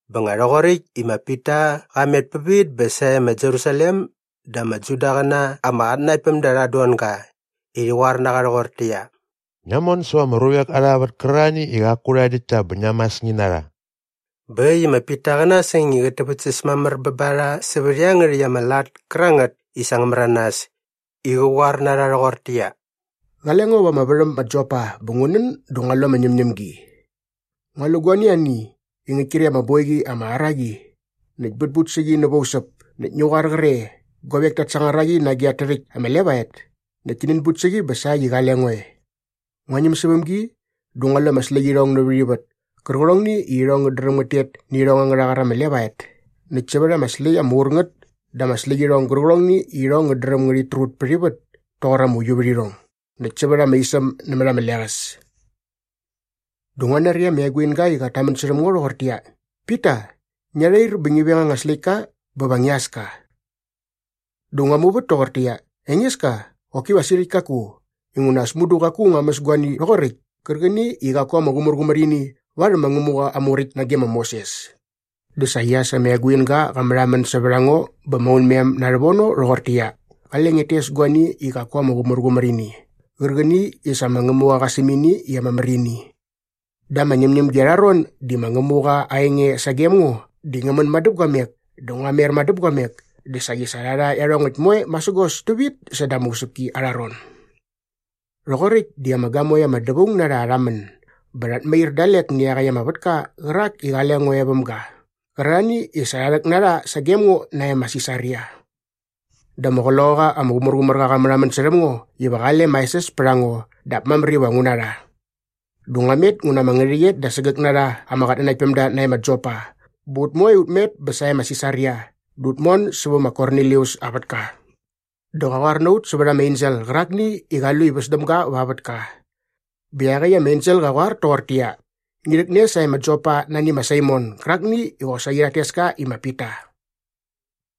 Bä nga rhoqoräkt i ma Pita qa met pävit bä sae ma Jerusalem dä ama Judaqäna ama qatnanaktpämda rhat don ga i rhi qoar na qa rhoqortäqyia, “Ngia mon säva ama ruvek arha vät kärarhani i qaku rha däkt ta bä ngia mäs ngi na rha.” Bä äkt i ma Pita qä nasäng i qät täväktsäs mamär bä ba rha sävät iangärhäkt ama lat kärangät i sa ngä märanas i qä qoar na rha rhoqortäqyia, “Qale ngo va ama värhäm ma Joppa bä ngu nän dä ngua lu ama ñämñämgi. Ngua lu guani ani i ngäkt kre ama boiqi ama ara qi näkt bätbut sä qi nävä usäp näkt ngi qoar qre guavek tat sangar a qi nage at tärhäkt ama levaet näkt ti nänbut sä qi bä sa äkt i qale ngo e. Ngua ñäm säväm gi dä ngua lu ama släqyirhong nävät ivät kärqärhongni i irhong ngät dräm ngät tet nä irhong angärha qar ama levaet näkt sävät ama släkt ama ur ngät dä ama släqyirhong gärqärhongni i irhong ngät dräm ngärhit trut pät ivät toqor ama uiuvärhirhong näkt sävät ama isäm nämät ama leqäs. Dä ngua nari ama eguinga i qat tamän särhäm ngo rhoqortäqyia, ‘Pita, ngia rhair bä ngi veng anga släktka bä va ngia äs ka.’ “Dä ngua muvät toqortäqyia, ‘Engeska, qoki va sirhäkt kaku inguna as mudu qaku ngua mäs guani rhoqoräkt kärqäni i qaku ama qumärqumär ini varhäm ma Ngämuqa aa Muräkt nage ma Moses.’ “Dä saqi as ama eguinga qa märhamän sävät a ngo bä maunmem na rhävono rhoqortäqyia, ‘Qale ngiat tes guani i qaku ama qumärqumär ini qärqäni i sa ma Ngämuqa qa säm ini i ama mär ini.’ Da ama ñämñämgi arha ron di ma Ngämuqa aa enge sagem ngo di ngä män madäpguamek dä ngua mer madäpguamek dä saqi sa rha rha iarhongäkt moe masägos tävit säda ama usäpki arha ron. “Rhoqoräkt di ama gamoe ama dävaung na rha rha män bä rhat mair dalek nä iaqäkt ama vätka qärak i qale ngo e väm ga qärarhani i sa rha rhäk na rha sagem ngo nae ma Sisaria. Dä ama Qloqaqa ama Qumärqumärqa qa märhamän särhäm ngo iva qale maesäs pät a ngo dap mamär iva ngu na rha. Dä ngua met ngu na ama ngärhäqyet da sägäk na rha ama qatnanaktpämda nae ma Jopa bä ut moe ut met bä sae ma Sisaria dä ut mon sävä ma Kornilius aa vätka. Dä qa qoar na ut sävät ama ensel qärakni i qa lu i väs däm ga va aa vätka bä iaqäkt ama ensel qa qoar toqortäqyia, ‘Ngi rhäkne sae ma Jopa nani ma Saimon gärakni i qosaqi rhat tes ka i ma Pita.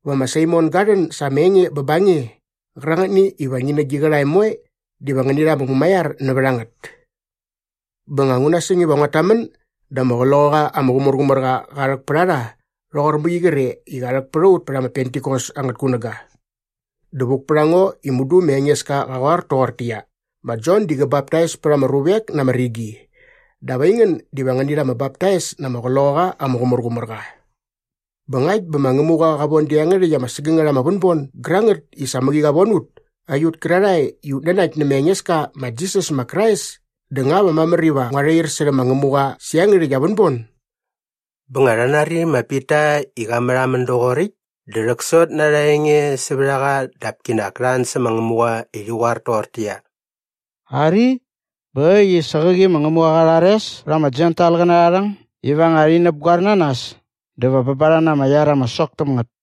Va ma Saimon ga rhän sa ama enge bä ba nge qärangätni iva ngi nä gi qärhae moe diva ngäni rha ama mumaiar nävät a ngät.’ “Bä nga ngu nasäng iva nguat tamän dä ama Qloqaqa ama Qumärqumärqa qa rhäk pät a rha rhoqor mäqi qre i qa rhäk pät a ut pät ma Pentikos angät kunäga. Dä vuk pät a ngo i mudu ma Engeska qa qoar toqortäqyia, ‘Ma Jon di qä baptais pät ama ruvek na ama rigi dap aingän diva ngäni rha ama baptais na ama Qloqaqa ama Qumärqumärqa.’ Bä ngakt bä ma Ngämuqa qa von da rhä iangärhäkt ama sägängät ama vänbon gärangät i sa mäqi qa von ut aiut kärarhae i ut nanakt nä ma Engeska ma Jisas ma Krais dä nga va mamär iva ngua rhair särhäm ma Ngämuqa sä iangärhäkt aa vänbon?” Bä nga rha nari ma Pita i qa märhamän doqoräkt dä rhäksot na arha enge sävät a qa dap kinak ta an sä ma Ngämuqa i rhi qoar toqortäqyia, “Ari, bä äkt i sa qäqi ma Ngämuqa qa rhares pät ama Jentailqäna arha rhäng iva nga rhi näpgoer na nas dä va bä ba rha na ama iar ama sok täm ngät.”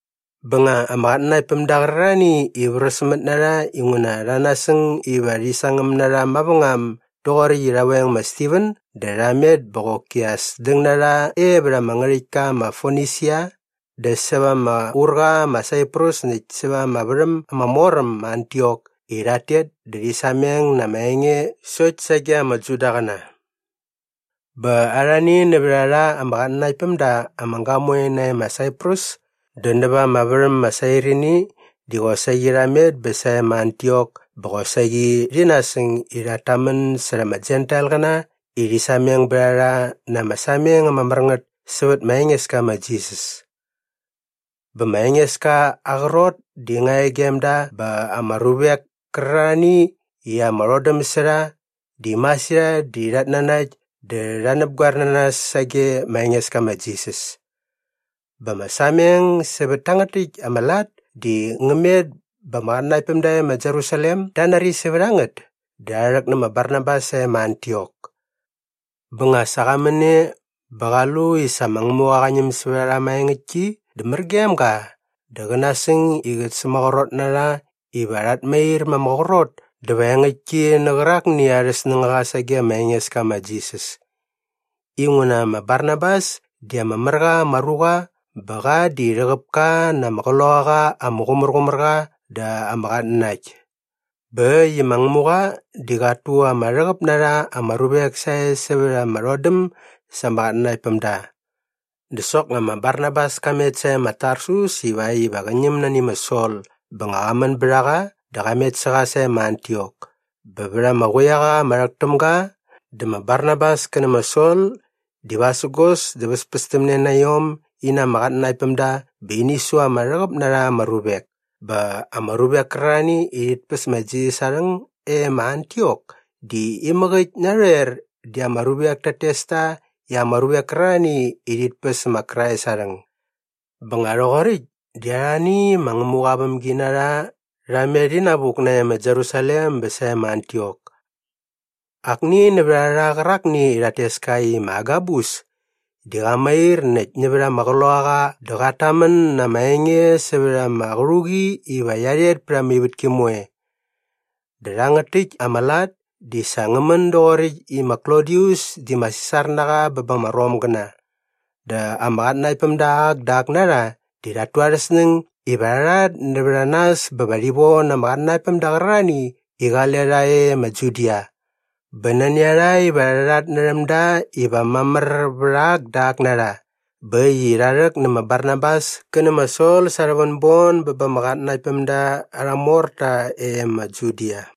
Bä nga ama qatnanaktpämda qärarhani i vräsmät na rha inguna rha nasäng iva rhi sangäm na rha mavängam doqoräkt i rha veng ma Stiven dä rha met bä qoki as däng na rha e vät ama ngärhäktka ma Fonisia dä säva ama urqa ma Saiprus näkt säva ama värhäm ama mor äm ma Antiok i rhat tet dä rhi sameng na ama enge sokt sage ama Judaqäna. Bä arhani nävät a rha ama qatnanaktpämda ama gamoe nae ma Saiprus dä näva ama värhäm ma Sairini di qosaqi rha met bä sae ma Antiok bä qosaqi rhi nasäng i rhat tamän särha ama Jentailqäna i rhi sameng bät a rha na ama sameng ama mär ngät sävät ma Engeska ma Jisas. Bä ma Engeska aa qrot di nga e gem da bä ama ruvek kärarhani i ama rhodäm sä rha di masirhat di rhat nanakt dä rha näpgoer na nas sage ma Engeska ma Jisas. Bä ama sameng sävät tangät täkt ama lat di ngä met bä ama qatnanaktpämda e ma Jerusalem da nari sävät a ngät dä rha rhäk nä ma Barnabas sae ma Antiok. Bä nga sa qa män e bä qa lu i sa ma Ngämuqa qa ñäm sävät a rha maengäktki dä mär gem ga dä qä nasäng i qä sämaqrot na rha iva rhat mair ma ama qrot dä va engäktki nä qärakni arhä snängaqa sage ma Engeska ma Jisas inguna ma Barnabas di ama mär qa ama ruqa bä qa di rhäqäp ka na ama Qloqaqa ama Qumärqumärqa dä ama qatnanakt. Bä äkt i ma Ngämuqa di qat tu ama rhäqäp na rha ama ruvek sae sävät ama rhodäm sa ama qatnanaktpämda. Dä soknga ma Barnabas ka met sae ma Tarsus ivakt iva qä ñäm nani ma Sol bä nga qa män bät a qa dä qa met sä qa sae ma Antiok. Bä vät ama quiaqa ama rhäk täm ga dä ma Barnabas kä nä ma Sol di vasägos dä väspästämne na iom in na ama qatnanaktpämda bä ini su ama rhäqäp na rha ama ruvek. Bä ama ruvek kärarhani i rhit päs ma Jisas aa rhäng e ma Antiok di imäk äkt narhoer di ama ruvek tat tes ta i ama ruvek kärarhani i rhit päs ma Krais aa rhäng. Bä nga rhoqoräkt di arhani ma Ngämuqa aa vämginarha rha met inavuk nae ma Jerusalem bä sae ma Antiok. Akni nävät a rha qärakni i rhat tes ka i ma Agabus di qa mair näkt nävät ama Qloqaqa dä qat tamän na ama enge sävät ama qärhuqi iva qia rhet pät ama ivätki moe. Dä rhangät täkt ama lat di sa ngä män doqoräkt i ma Klodius di ma Sisar na qa bä ba ama Romgäna. Dä ama qatnanaktpämda ak dä ak na rha di rhat tu arhä snäng iva rha rhat nävät a nas bä rhi von ama qatnanaktpämda qärarhani i qale rha e ma Judia. Bä nani a rha iva rha rhatnärhäm da iva mamär vät ak dä ak na rha. Bä äkt i rha rhäk nä ma Barnabas kä nä ma Sol sa arhä vänbon bä ba ama qatnanaktpämda arha morta e ma Judia.